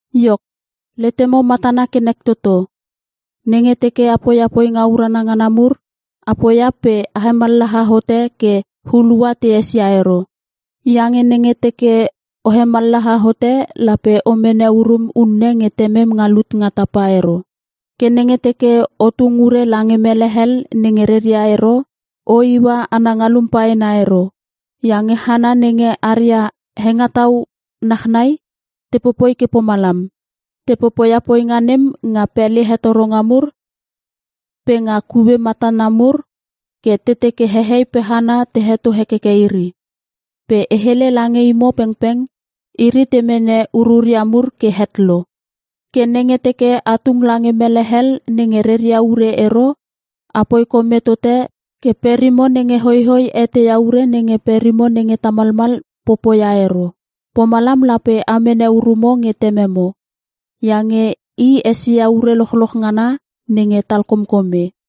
“Iok, letemo matana ke nek toto. Nenge teke a poia poinga urana ngana mur a poia pe a hemallaha hote ke hulua te esia ero. Iange nenge teke o hemallaha hote lape o mene urum unne nge Temem nga lut nga tapa ero. “Ke nenge teke o tung ure lange mele hel nenge reria ero o iua ana ngalum paena ero. Iange hana nenge aria hengetau nachnai te popoi ke pomalam. Te popoia poinga nem nga pele hetoronga mur pe nga kue matana mur ke te teke hehei pe hana te heto hekeke iri. Pe e hele lange imo pengpeng iri te mene ururia mur ke het lo. Ke nenge teke a tung lange mele hel nenge reria ure ero apoi kome tote ke perimo nenge hoihoi eteia ure nenge perimo nenge tamalmal popoia ero. Pomalam lape a mene urumo nge Tememo. Iange I esia ure lochloch ngana nenge talkomkome.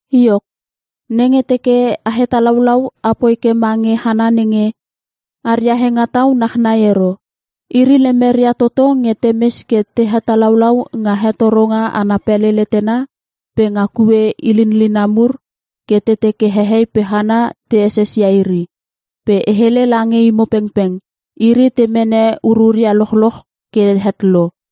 “Iok, nenge teke a hetalaulau apoi ke mange hana nenge aria hengetau nachnai ero. Iri lemeria toto nge temes ke te hetalaulau nga hetoronga ana pele letena pe nga kue ilinlina mur ke te teke hehei pe hana te esesia iri. Pe e hele lange imo pengpeng iri te mene ururia lochloch ke het lo.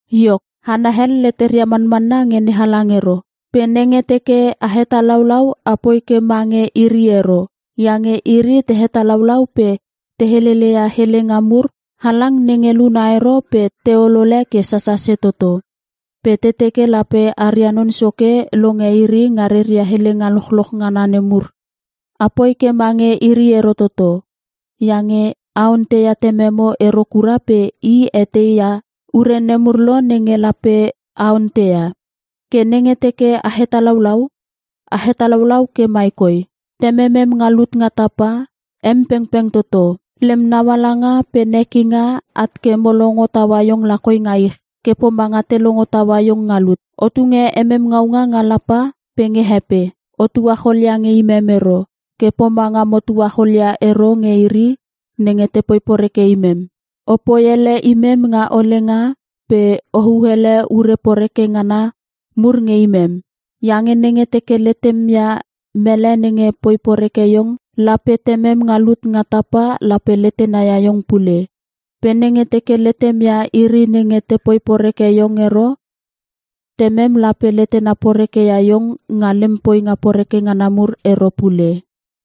Iok, hana hel leteria manmanna nge NeHalang ero. Pe nenge teke a hetalaulau apoi ke ma nge iri ero. Iange iri te hetalaulau pe te heleleia helenga mur halang nenge luna ero pe te olole ke sasase toto. Pe te teke lape aria non soke longe iri nga reria helenga lochloch ngana nemur. A poi ke mange iri ero toto. Iange a onteia Tememo ero kura pe I etei ia ure nemur lo nenge lape a onteia. “Ke nenge teke a hetalaulau, a hetalaulau ke mai koi; “‘Tememem nga lut nga tapa em pengpeng toto. Lem naualanga pe nekinga at ke mo longo taua iong lakoi nga ich ke pomanga te longo taua iong nga lut. O tunge emem ngaunga nga lapa pe nge he pe. O tuacholia nge imem ero ke pomanga mo tuacholia ero nge iri nenge te poi poreke imem. O poi ele imem nga olenga pe o hu hele ure poreke ngana mur nge imem.’ Iange nenge teke letem ia mele nenge poi poreke iong lape Temem nga lut nga tapa lape letena ia iong pule. Pe nenge teke letem ia iri nenge te poi poreke iong ero Temem lape letena porekeia iong nga lem poinga poreke ngana mur ero pule.”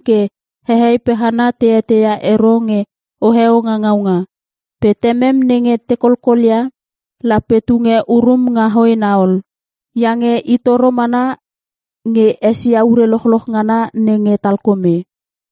ke hehei pe hana te eteia ero nge oheo nga ngaunga. Pe Temem nenge ta kolkolia lape tunge urum nga hoena ol. Iange I toro mana nge esia ure lochloch ngana nenge talkome.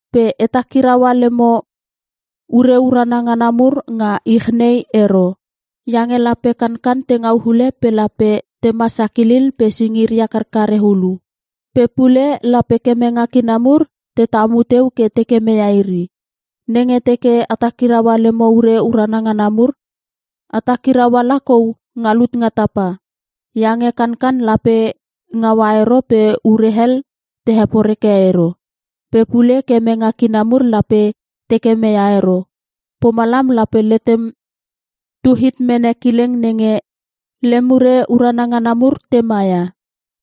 “Pe a takiraua lemo ure urana ngana mur nga ich nei ero. Iange lape kankan te ngau hule pe lape tema sakilil pe singiria karkare hulu. Pe pule lape kemenge kina mur te tamu teu ke te kemeia iri. Nenge teke a takirau lemo ure urana ngana mur a takiraua lakou nga lut nga tapa. Iange kankan lape ngaua ero pe ure hel te heporeke ero. Pe pule kemenge kina mur lape te kemeia ero. Pomalam lape letem tu hit mene kileng nenge lem ure urana ngana mur te maia.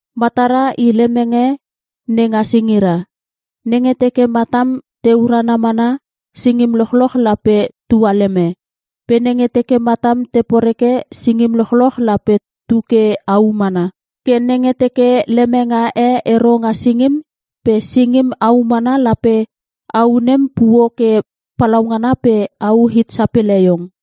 “Matara i lemenge nenga singira. Nenge teke matam te urana mana singim lochloch lape tualeme. Pe nenge teke matam te poreke singim lochloch lape tu ke au mana. Ke nenge teke lemenga e ero nga singim pe singim au mana lape au nem puo ke palaungana pe au hit sapele iong.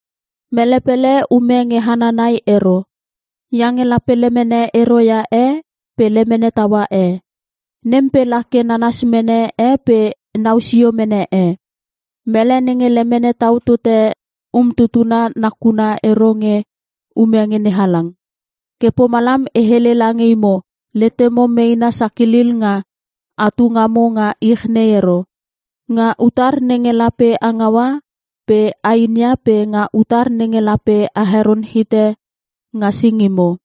“Mele pele ume nge hana nai ero. Iange lape lemene ero ia e pe lemene taua e. Nem pe la ke nanas mene e pe nau sio mene e. Mele nenge lemene tau tote umtutuna nakuna ero nge ume nge NeHalang. “Ke pomalam e hele lange imo letemo meena sakilil nga atu ngamo nga ich nei ero. Nga utar nenge lape a ngaua pe a inia pe nga utar nenge lape a heron hite nga singimo.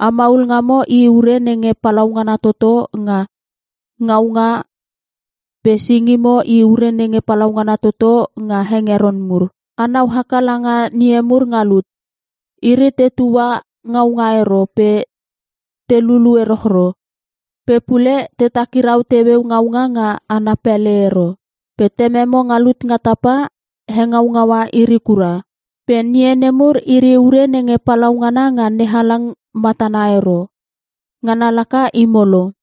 A maul ngamo i ure nenge palaungana toto nga ngaunga pe singimo i ure nenge palaungana toto nga hengeron mur. A nau haka langa ngie mur nga lut. Iri tetua ngaunga ero pe te lulu erochro. Pe pule te takirau teueu ngaunga nga ana pele ero. Pe Tememo nga lut nga tapa hengaungaua iri kura. Pe ngie nemur iri ure nenge palaungana nga NeHalang matana ero. Ngana laka imo lo.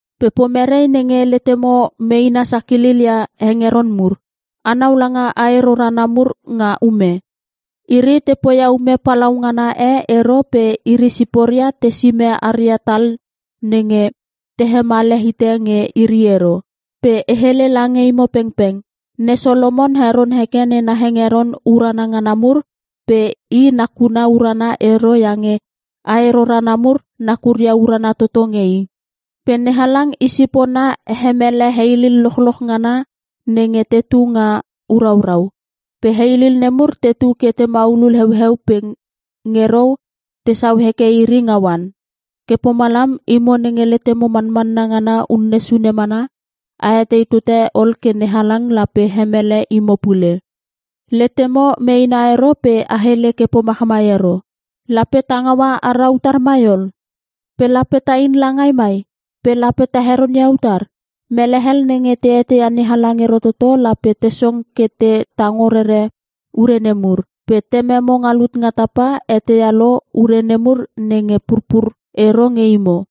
Pe pomere nenge letemo meena sakilil ia hengeron mur? A nau langa ae rorana mur nga ume. Iri te poia ume palaungana e ero pe iri siporia te sime aria tal nenge te hemale hite nge iri ero. Pe e hele lange imo pengpeng Ne Solomon heron heke nena hengeron urana ngana mur pe i nakuna urana ero iange ae rorana nemur nakuria urana toto nge i. Pe NeHalang Isipona hemele heilil lochloch ngana nenge tetu nga uraurau. Pe heilil nemur tetu ke te maulul heueu pe nge rou tesau heke iri nga oan. Ke pomalam imo nenge letemo manmanna ngana unne sune mana a etei tote ol ke NeHalang lape hemele imo pule! Letemo meena ero pe a hele ke pomachmai ero: ‘Lape ta ngaua ara utar mai ol? Pe lape ta in langai mai? Pe lape ta heron ia utar?’ Melehel nenge te eteia NeHalang ero toto lape te song ke te tango rere ure nemur. Pe Tememo nga lut nga tapa eteia lo ure nemur nenge purpur ero nge imo.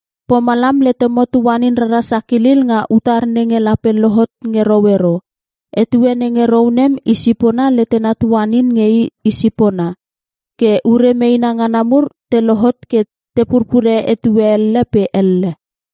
Pomalam letemo tuanin rara sakilil nga utar nenge lape lohot nge rou ero. Etue nenge rou nem i sipona letena tuaninin nge i sipona. Ke ure meena ngana mur te lohot ke te purpure etue elle pe elle.